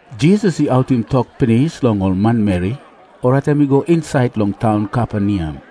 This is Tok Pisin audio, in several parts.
Jisas i autim tok pinis long ol manmeri, orait em i go insait long taun Kaperneam.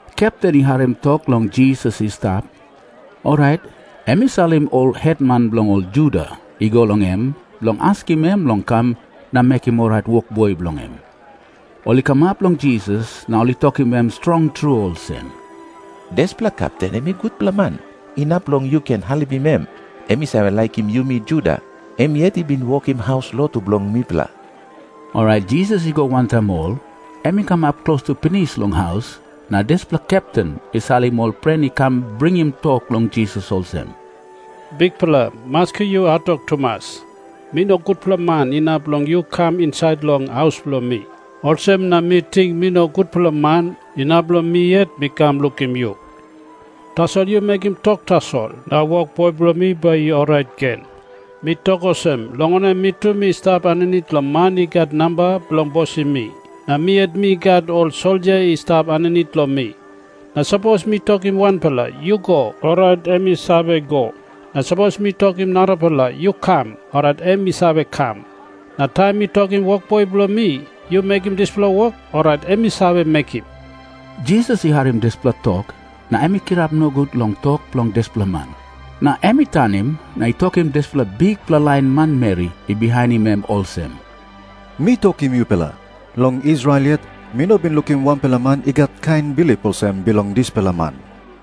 Kepten i harim tok long Jisas i stap, orait em i salim ol hetman bilong ol Juda i go long em bilong askim em long kam na mekim orait wokboi bilong em. Ol i kamap long Jisas na ol i tokim em strong tru olsem, “Dispela kepten em i gutpela man, inap long yu ken helpim em. Em i save laikim yumi Juda. Em yet i bin wokim haus lotu bilong mipela.” Orait Jisas i go wantaim ol. Em i kamap klostu pinis long haus, na dispela kepten i salim ol pren i kam bringim tok long Jisas olsem, “Bikpela, maski yu hatwok tumas. Mi no gutpela man inap long yu kam insait long haus bilong mi. Olsem na mi ting mi no gutpela man inap long mi yet mi kam lukim yu. Tasol yu mekim tok tasol, na wokboi bilong mi bai i orait gen. Mi tok olsem, long wanem, mi tu mi stap aninit long man i gat namba bilong bosim mi. Na mi yet mi gat ol soldia i stap aninit long mi. Na sapos mi tokim wanpela, ‘Yu go’, orait em i save go. Na sapos mi tokim narapela, ‘Yu kam’, orait em i save kam. Na taim mi tokim wokboi bilong mi, ‘Yu mekim dispela wok’, orait em i save mekim.” Jisas i harim dispela tok, na em i kirap nogut long tok bilong dispela man. Na em i tanim na i tokim dispela bikpela lain manmeri i bihainim em olsem, “Mi tokim yupela, long Israel yet mi no bin lukim wanpela man i gat kain bilip olsem bilong dispela man.”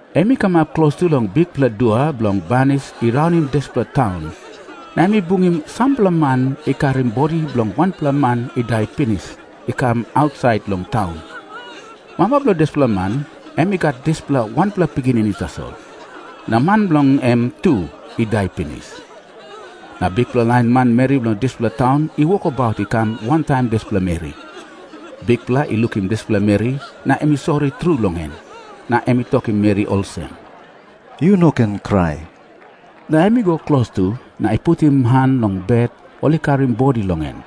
Em i kamap klostu long bikpela dua bilong banis i raunim dispela taun, na em i bungim sampela man i karim bodi bilong wanpela man i dai pinis i kam ausait long taun. Mama bilong dispela man, em i gat dispela wanpela pikinini tasol. Na man bilong en tu i dai pinis. Na bikpela lain manmeri bilong dispela taun i wokabaut i kam wantaim dispela meri. Bikpela i lukim dispela meri, na em i sori tru long em, na em i tokim meri olsem, “Yu no ken krai.” Na em i go klostu, na i putim han long bet ol i karim bodi long en.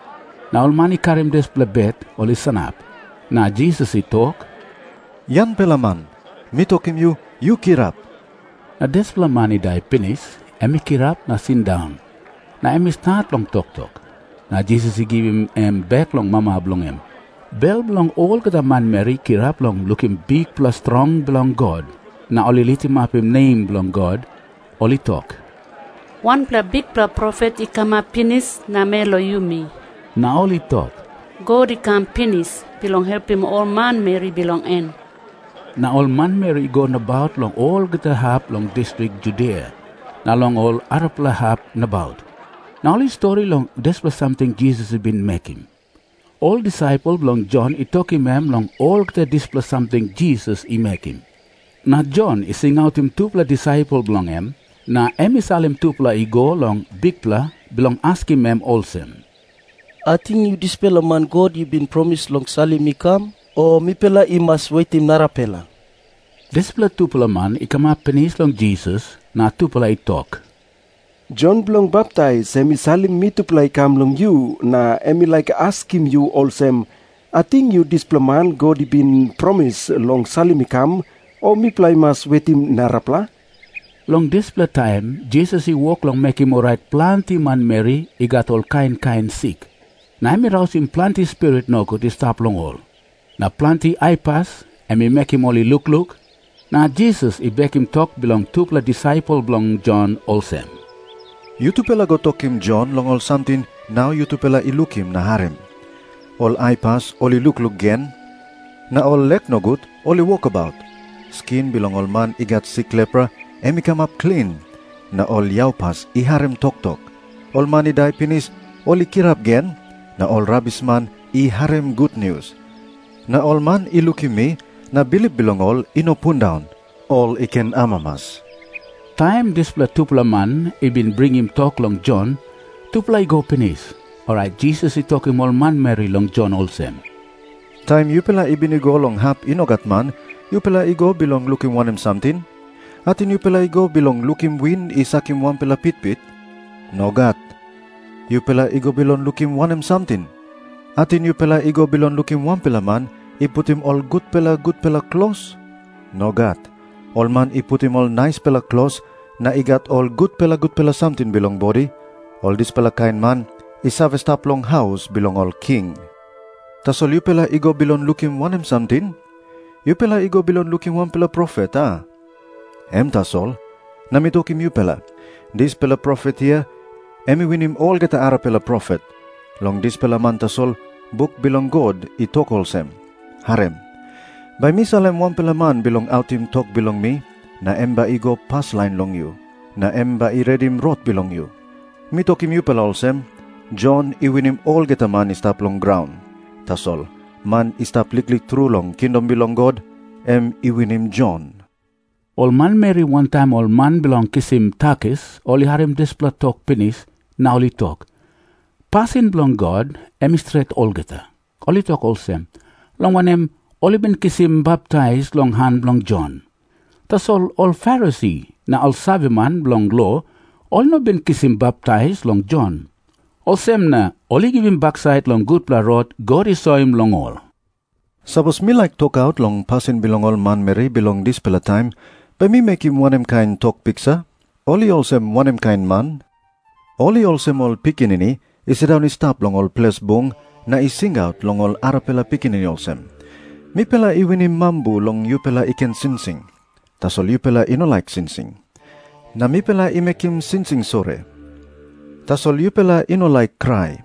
Na ol man i karim dispela bet ol i sanap. Na Jisas i tok, “Yangpela man, mi tokim yu, yu kirap.” Na dispela man i dai pinis, em i kirap na i sindaun, na em i stat long toktok. Na Jisas i givim em bek long mama bilong en. Bel bilong olgeta manmeri i kirap long lukim bikpela strong bilong God, na ol i litimapim nem bilong God. Ol i tok, “Wanpela bikpela profet i kamap pinis namel long yumi.” Na ol i tok, “God i kam pinis bilong helpim ol manmeri bilong en.” Na ol manmeri i go nabaut long olgeta hap bilong distrik Judia na long ol arapela hap nabaut, na ol i stori long dispela samting Jisas i bin mekim. Ol disaipel bilong Jon i tokim em long olgeta dispela samting Jisas i mekim. Na Jon i singautim tupela disaipel bilong en, na em i salim tupela i go long Bikpela bilong askim em olsem, “Ating yu dispela man God i bin promis long salim i kam, o mipela i mas wetim narapela?” Dispela tupela man i kamap pinis long Jisas, na tupela i tok, “Jon Bilong Baptais em i salim mitupela i kam long yu, na em i laik askim yu olsem, ‘Ating yu dispela man God i bin promis long salim i kam, o mipela i mas wetim narapela?’” Long dispela taim Jisas i wok long mekim orait planti manmeri i gat ol kain kain sik. Na em i rausim planti spirit nogut i stap long ol. Na planti aipas, em i mekim ol i lukluk. Na Jisas i bekim tok bilong tupela disaipel bilong Jon olsem, “Yutupela go tokim Jon long ol samting nau yutupela i lukim na harim. Ol aipas ol i lukluk gen, na ol lek nogut ol i wokabaut. Skin bilong ol man i gat sik lepra, em i kamap klin, na ol yaupas i harim toktok. Ol man i dai pinis, ol i kirap gen, na ol rabisman i harim gutnius. Na ol man i lukim mi, na bilip bilong ol i no pundaun, ol i ken amamas.” Taim dispela tupela man i bin bringim tok bilong Jon, tupela i go pinis, orait Jisas i tokim ol manmeri long Jon olsem, “Taim yupela i bin i go long hap i no gat man, yupela i go bilong lukim wanem samting? Ating yupela i go bilong lukim win i sakim wanpela pitpit? Nogat. Yupela i go bilong lukim wanem samting? Ating yupela i go bilong lukim wanpela man i putim ol gutpela gutpela klos? Nogat. Ol man i putim ol naispela klos na i gat ol gutpela gutpela samting bilong bodi, ol dispela kain man i save stap long haus bilong ol king. Tasol yupela i go bilong lukim wanem samting? Yupela i go bilong lukim wanpela profet, a? Em tasol. Na mi tokim yupela, dispela profet hia, em i winim olgeta arapela profet. Long dispela man tasol buk bilong God i tok olsem, ‘Harim. Bai mi salim wanpela man bilong autim tok bilong mi, na em bai i go paslain long yu. Na em bai i redim rot bilong yu.’ Mi tokim yupela olsem, Jon i winim olgeta man i stap long graun. Tasol man i stap liklik tru long kingdom bilong God, em i winim Jon.” Ol manmeri wantaim ol man bilong kisim takis ol i harim dispela tok pinis, na ol i tok, “Pasin bilong God em i stret olgeta.” Ol i tok olsem, long wanem, ol i bin kisim baptais long han bilong Jon. Tasol ol Farisi na ol saveman bilong lo ol i no bin kisim baptais long Jon. Olsem na ol i givim baksait long gutpela rot God i soim long ol. Na Jisas i tok moa olsem, “Sapos mi laik tokaut long pasin bilong ol manmeri bilong dispela taim, bai mi mekim wanem kain tok piksa? Ol i olsem wanem kain man? Ol i olsem ol pikinini i sindaun i stap long ol ples bung na i singaut long ol arapela pikinini olsem, ‘Mipela i winim mambu long yupela i ken singsing, tasol yupela i no laik singsing. Na mipela i mekim singsing sori, tasol yupela i no laik krai.’”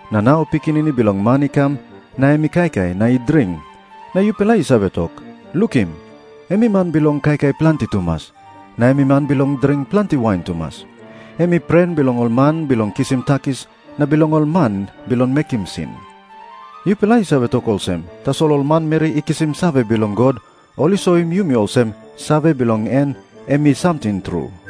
Na nau Pikinini Bilong Man i kam, na em i kaikai na i dring, na yupela i save tok, ‘Lukim, em i man bilong kaikai planti tumas, na em i man bilong dring planti wain tumas. Em i pren bilong ol man bilong kisim takis na bilong ol man bilong mekim sin.’ Yupela i save tok olsem, tasol ol manmeri i kisim save bilong God ol i soim yumi olsem save bilong en em i samting tru.”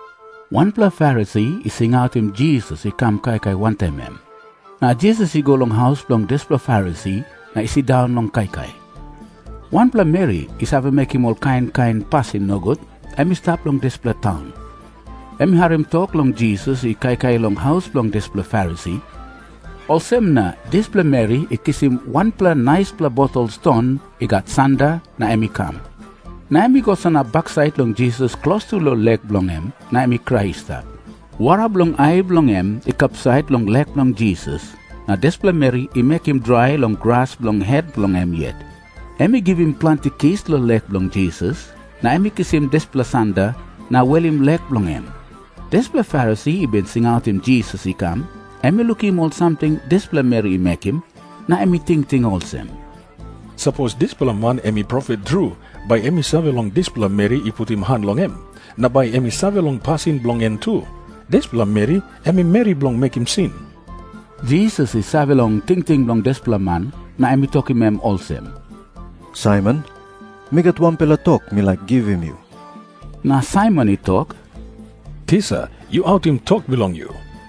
Wanpela Farisi i singautim Jisas i kam kaikai wantaim em. Na Jisas i go long haus bilong dispela Farisi na i sindaun long kaikai. Wanpela meri i save mekim ol kain kain pasin nogut em i stap long dispela taun. Em i harim tok long Jisas i kaikai long haus bilong dispela Farisi, olsem na dispela meri i kisim wanpela naispela botol ston i gat sanda na em i kam. Na em i go sanap baksait long Jisas klostu long lek bilong en, na em i krai i stap. Wara bilong ai bilong en i kapsait long lek bilong Jisas, na dispela meri i mekim drai long gras bilong het bilong em yet. Em i givim planti kis long lek bilong Jisas, na em i kisim dispela sanda na welim lek bilong en. Dispela Farisi i bin singautim Jisas i kam, em i lukim ol samting dispela meri i mekim, na em i tingting olsem, “Sapos dispela man em i profet tru, bai em i save long dispela meri i putim han long em, na bai em i save long pasin bilong en tu. Dispela meri em i meri bilong mekim sin.” Jisas i save long tingting bilong dispela man na em i tokim em olsem, “Saimon, mi gat wanpela tok mi laik givim yu.” Na Saimon i tok, “Tisa, yu autim tok bilong yu.”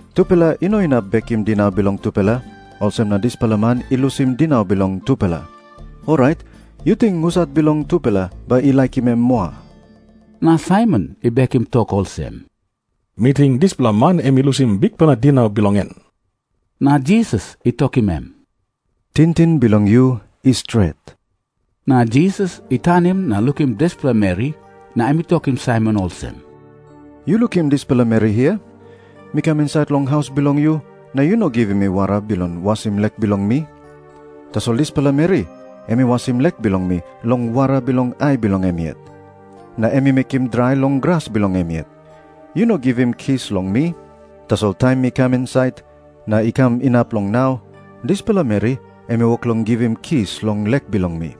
Tupela i no inap bekim dinau bilong tupela, olsem na dispela man i lusim dinau bilong tupela. Orait yu ting husat bilong tupela bai i laikim em moa?” Na Saimon i bekim tok olsem, “Mi ting dispela man em i lusim bikpela dinau bilong en.” Na Jisas i tokim em, “Tingting bilong yu i stret.” Na Jisas i tanim na lukim dispela meri, na em i tokim Saimon olsem, “Yu lukim dispela meri hia? Mi kam insait long haus bilong yu, na yu no givim mi wara bilong wasim lek bilong mi. Tasol dispela meri em i wasim lek bilong mi long wara bilong ai bilong em yet. Na em i mekim drai long gras bilong em yet. Yu no givim kis long mi. Tasol taim mi kam insait, na i kam inap long nau, dispela meri em i wok long givim kis long lek bilong mi.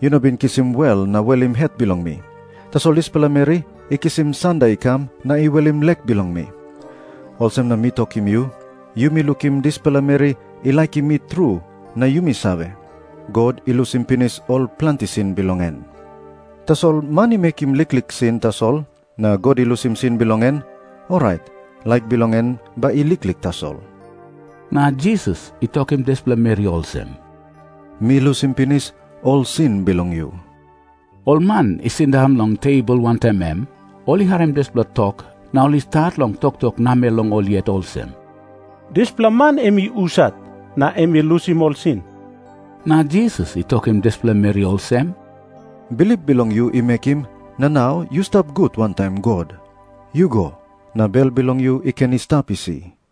Yu no bin kisim wel na welim het bilong mi. Tasol dispela meri i kisim sanda i kam na i welim lek bilong mi. Olsem na mi tokim yu, yumi lukim dispela meri i laikim mi tru na yumi save, God i lusim pinis ol planti sin bilong en. Tasol man i mekim liklik sin tasol na God i lusim sin bilong en, orait laik bilong en bai i liklik tasol.” Na Jisas i tokim dispela meri olsem, “Mi lusim pinis ol sin bilong yu.” Ol man i sindaun long tebol wantaim em, ol i harim dispela tok na ol i stat long toktok namel long ol yet olsem, “Dispela man em i husat na em i lusim ol sin?” Na Jisas i tokim dispela meri olsem, “Bilip bilong yu i mekim na nau yu stap gut wantaim God. Yu go, na bel bilong yu i ken i stap isi.”